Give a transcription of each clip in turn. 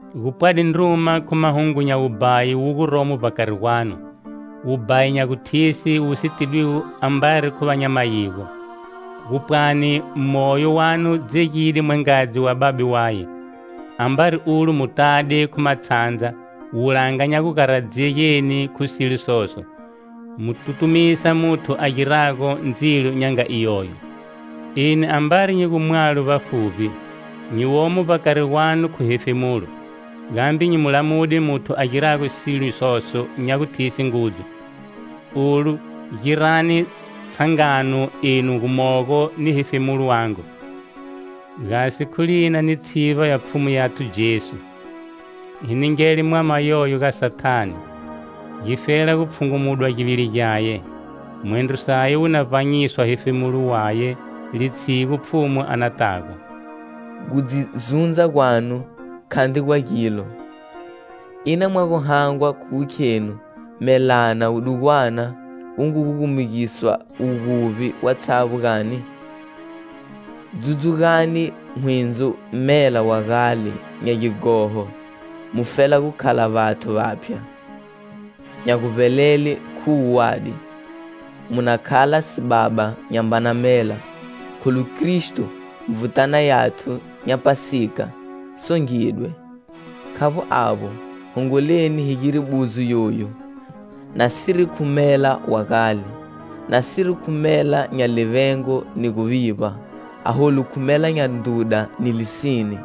Gu pwade ndruma khu mahungu nya wubhayi wu guromo vbakari gwanu, wubhayi nya guthise wu si tidwigo ambari khu va nya mayigo; gu pwani moyo wanu dzegide mwangadzi wa babe waye. Ambari ulo mu tade khu matshandza, wulanga nya gu garadzegeni khu silo soso, mu tutumisa muthu a girago ndzilo nya nga iyoyo. Eni ambari nyi gu mwalo vbafuvbi, nyi womo vbakari gwanu khu hefemulo, gambe nyi mu lamude muthu a girago silo soso nya guthise ngudzu. Olu girani tshangano enu gumogo ni hefemulo wangu, gasi khu tshivba ya Pfhumu yathu Jesu, hi ningele mwama yoyo ga Sathane, gifela gu pfhungunudwa givili gyaye, mwendro saye wu na vbanyiswa hefemulo waye litshigu Pfhumu a natago. Gu dzi zundza gwanu khandri gwa gilo. Ina mwa gu hangwa khu gu khenu melana wudugwana wu ngu gugumugisa wuguvbi watshavbo, gani? Dzudzugani hwindzo mela wa gale nya gighoho, mufela gu khala vathu vaphya, nya guvbelele khu wuwadi; mu na khala sibaba nyambana mela, kholu Kristo, Nvutana yathu nya Phasika, songidwe. Khavbo avbo, hongoleni hi gire buzo yoyu, nasiri khu mela wa gale, nasiri khu mela nya livengo ni guvivba, aholu khu mela nya ndruda ni lisine.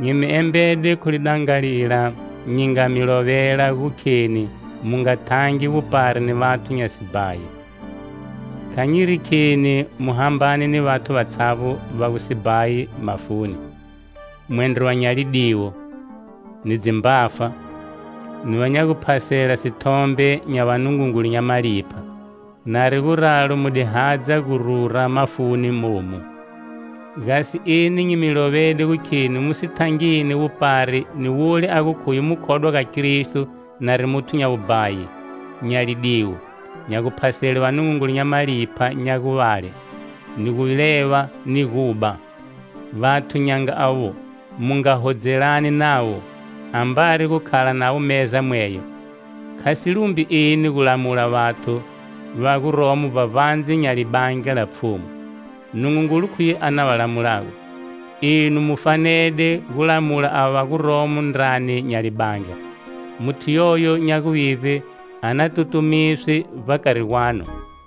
Nyi mi embede khu lidangalila nyi nga mi lovela gu kheni mu nga thangi wupari ni vathu nya sibhayi. Kha nyiri kheni mu hambane ni vathu vatshavbo va gu sibhayi mafuni, mwendro va nya lidiwo, ni dzimbafa, ni va nya guphasela sithombe nya vanungungulu nya malipha; nari guralo mu di hadza gu rura mafuni momu. Gasi eni nyi mi lovede gu kheni mu si thangini wupari ni wule a gu khuye mukhodwa ga Kristo nari muthu nya wubhayi, nya lidiwo, nya guphasele vanungungulu nya malipha nya guvale, ni guleva ni guba. Vathu nya nga avo mu nga hodzelani navo, ambari gu khala navo meza mweyo. Kha si lumbi eni gu lamula vathu va guromo vbavandze nya libandla la Pfhumu. Nungungulu khuye a na va lamulago. Enu mu fanede gu lamula ava va guromo ndrani nya libandla. Muthu yoyo nya guvivbe a na tutumiswe vbakari gwanu.